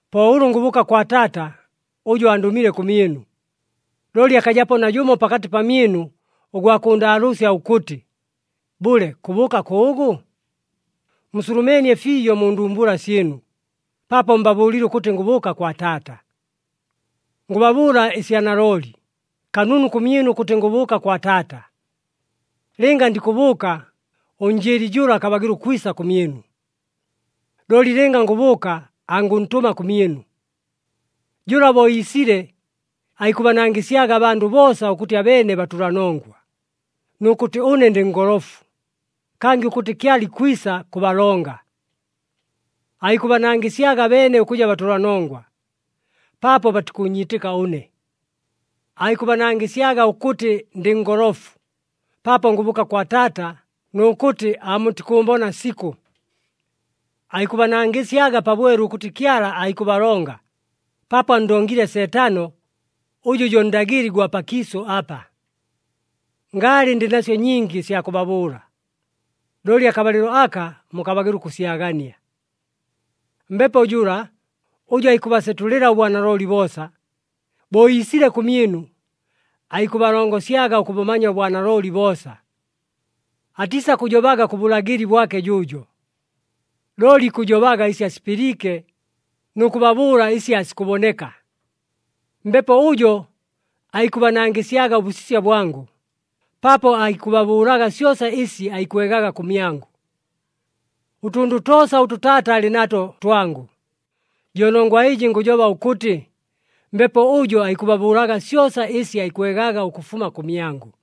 Po ʉlʉ ngʉbʉʉka kwa Taata ʉjʉ andʉmile kʉmyɨnu. Looli akajapo najʉmo pakatɨ pamyɨnu ʉgwa kʉʉndaalʉʉsya ʉkʉtɨ, ‘Bʉle, kʉbʉʉka kʉʉgʉ?’ Musulumeenie fiijo mu ndumbula syɨnu paapo mbabʉʉlile ʉkʉtɨ ngʉbʉʉka kwa Taata. “Ngʉbabʉʉla ɨsya nalooli, kanunu kʉmyɨnu ʉkʉtɨ ngʉbʉʉka kwa Taata. Lɨnga ndikʉbʉʉka, ʉNjɨɨli jʉla akabagɨla ʉkwisa kʉmyɨnu. Looli lɨnga ngʉbʉʉka, angʉntʉma kʉmyɨnu. Jʉla bo iisile, aikʉbanangɨsyaga abandʉ boosa ʉkʉtɨ abeene batʉlanongwa, nʉ kʉtɨ ʉne ndɨ ngolofu, kangɨ ʉkʉtɨ Kyala ikwisa kʉbalonga. Aikʉbanangɨsyaga abeene ʉkʉja batʉlanongwa, paapo batikʉʉnyiitɨka ʉne. Aikʉbanangɨsyaga ʉkʉtɨ ndɨ ngolofu paapo ngʉbʉʉka kwa Taata nʉ kʉtɨ aamutikʉʉmbona sikʉ. Aikʉbanangɨsyaga pabwelu ʉkʉtɨ Kyala aikʉbalonga paapo anndongile Seetano ʉjʉ jo ndagɨli gwa pakiisʉ apa. “Ngaalɨ ndɨ nasyo nyingi ɨsya kʉbabʉʉla, looli akabalɨlo aka mukabagɨla ʉkʉsyagania. Mbepo jʉla, ʉjʉ aikʉbasetʉlɨla ʉbwanalooli boosa, bo iisile kʉmyɨnu, aikʉbalongosyaga ʉkʉbʉmanya ʉbwanalooli boosa. Atiisakʉjobaga kʉ bʉlagɨli bwake jʉʉjo, looli ikʉjobaga ɨsi asipɨliike nʉ kʉbabʉʉla ɨsi aasikʉboneka. Mbepo ʉjo aikʉbanangɨsyaga ʉbʉsisya bwangʉ, paapo aikʉbabʉʉlaga syosa ɨsi aikwegaga kʉmyangʉ. Ʉtʉndʉ toosa ʉtʉ Taata alɨ nato twangʉ. Jo nongwa ɨjɨ ngʉjoba ʉkʉtɨ Mbepo ʉjo aikʉbabʉʉlaga syosa ɨsi aikwegaga ʉkʉfuma kʉmyangʉ.”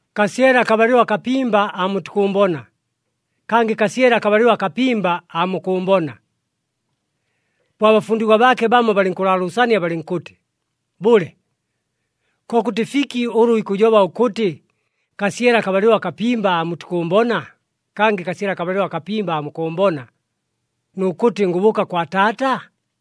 “Kasyele akabalɨlo akapimba aamutikʉʉmbona, kangɨ kasyele akabalɨlo akapimba aamukʉʉmbona.” Po abafundigwa baake bamo balɨnkʉlaalʉʉsania balɨnkʉtɨ, “Bʉle, kokʉtɨ fiki ʉlʉ ikʉjoba ʉkʉtɨ, ‘Kasyele akabalɨlo akapimba aamutikʉʉmbona, kangɨ kasyele akabalɨlo akapimba aamukʉʉmbona,’ nʉ kʉtɨ, ‘Ngʉbʉʉka kwa Taata’?”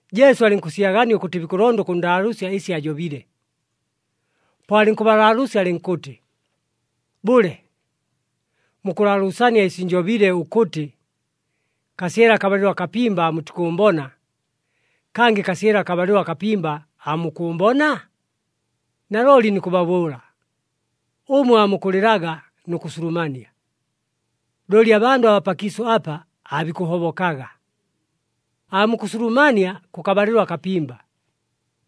Jesu alɨnkʉsyagania ʉkʉtɨ bikʉlonda ʉkʉnndaalʉʉsya ɨsi ajobile, po alɨnkʉbalaalʉʉsya alɨnkʉtɨ, “Bʉle, mukʉlaalʉʉsania ɨsi njobile ʉkʉtɨ, ‘Kasyele akabalɨlo akapimba aamutikʉʉmbona, kangɨ kasyele akabalɨlo akapimba aamukʉʉmbona?’ Nalooli nikʉbabʉʉla, ʉmwe aamukʉlɨlaga nʉ kʉsulumania, looli abandʉ abaa pakiisʉ apa aabikʉhobokaga. Aamukʉsulumania kʉkabalɨlo akapimba,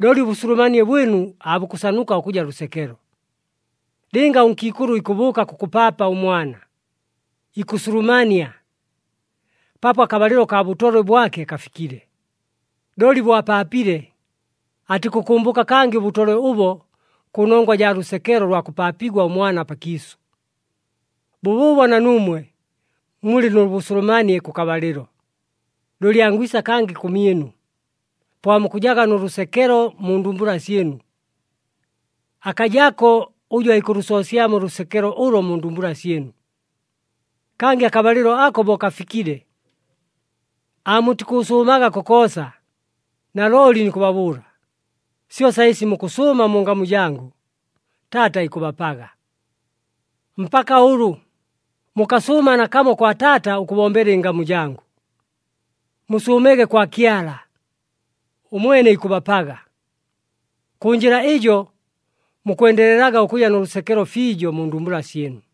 looli ʉbʉsulumanie bwɨnu aabukʉsanuka ʉkʉja lʉsekelo. Lɨnga ʉnkiikʉlʉ ikʉbʉʉka kʉkʉpaapa ʉmwana, ikʉsulumania paapo akabalɨlo kaa bʉtolwe bwake kafikile. Looli bo apaapile, atikʉkʉmbʉka kangɨ ʉbʉtolwe ʉbo kʉnongwa jaa lʉsekelo lwa kʉpaapigwa ʉmwana pakiisʉ. Bʉbʉʉbo na nuumwe mulɨ nʉ bʉsulumanie kʉkabalɨlo. Looli angwisa kangɨ kʉmyɨnu, po aamukʉjaga nʉ lʉsekelo mu ndumbula syɨnu. Akajako ʉjʉ aikʉlʉsoosyamo ʉlʉsekelo ʉlo mu ndumbula syɨnu. Kangɨ akabalɨlo ako bo kafikile, aamutikʉʉsʉʉmaga kokoosa. Nalooli nikʉbabʉʉla, syosa ɨsi mukʉsʉʉma mu ngamu jangʉ, Taata ikʉbapaga. Mpaka ʉlʉ, mukasʉʉma nakamo kwa Taata ʉkʉbombela ɨngamu jangʉ. Musʉʉmege kwa Kyala, ʉmwene ikʉbapaga. Kʉ njɨla ɨjo mukwendelelaga ʉkʉja nʉ lʉsekelo fiijo mu ndumbula syɨnu.”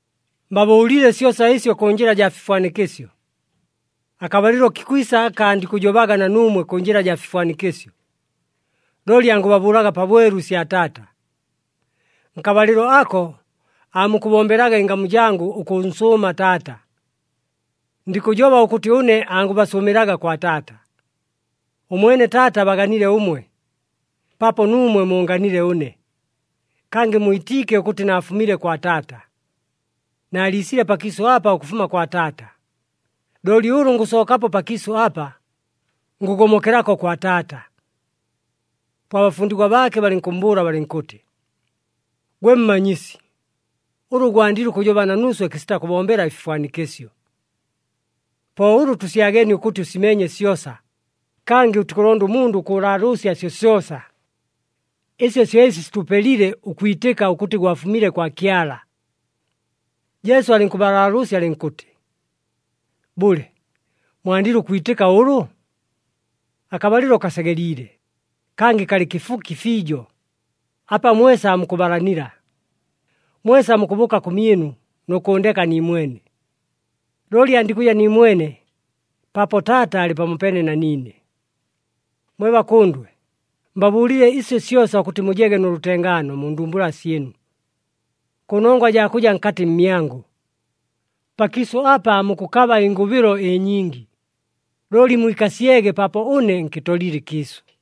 “Mbabʉʉlile syosa ɨsyo kʉ njɨla jaa fifwanikɨsyo. Akabalɨlo kikwisa aka andikʉjobaga na nuumwe kʉ njɨla jaa fifwanikɨsyo, looli angʉbabʉʉlaga pabwelu ɨsya Taata. Nkabalɨlo ako, aamukʉbombelaga ɨngamu jangʉ ʉkʉnsʉʉma Taata. Ndikʉjoba ʉkʉtɨ ʉne angʉbasʉʉmɨlaga kwa Taata. Ʉmwene Taata abaganile ʉmwe, paapo nuumwe muunganile ʉne, kangɨ mwitiike ʉkʉtɨ naafumile kwa Taata. Naaliisile pakiisʉ apa ʉkʉfuma kwa Taata, looli ʉlʉ ngʉsookapo pakiisʉ apa, ngʉgomokelako kwa Taata.” Po abafundigwa baake balɨnkʉmmbʉʉla balɨnkʉtɨ, “Gwe Mmanyisi, ʉlʉ gwandile ʉkʉjoba na nuuswe kɨsita kʉbombela ɨfifwanikɨsyo! Po ʉlʉ tʉsyageenie ʉkʉtɨ ʉsimeenye syosa, kangɨ ʉtikʉlonda ʉmundʉ ʉkʉlaalʉʉsya syosyosa. Ɨsyo syo ɨsi sitʉpelile ʉkwitɨka ʉkʉtɨ gwafumile kwa Kyala.” Jesu alɨnkʉbalaalʉʉsya alɨnkʉtɨ, “Bʉle, mwandile ʉkwitɨka ʉlʉ? Akabalɨlo kasegeliile, kangɨ kalɨ kɨfuki fiijo, apa mwesa aamukʉbalanila. Mwesa mukʉbʉʉka kʉmyɨnu, nʉ kʉʉndeka niimwene. Looli andikʉja niimwene, paapo Taata alɨ pamopeene na niine. Mwe bakʉndwe, mbabʉʉlile ɨsyo syosa ʉkʉtɨ mujege nʉ lʉtengaano mu ndumbula syɨnu, kʉnongwa jaa kʉja nkatɨ mmyangʉ. Pakiisʉ apa aamukʉkaba ɨngʉbɨlo ɨnyingi, looli mwikasyege paapo ʉne nkɨtolile ɨkiisʉ.”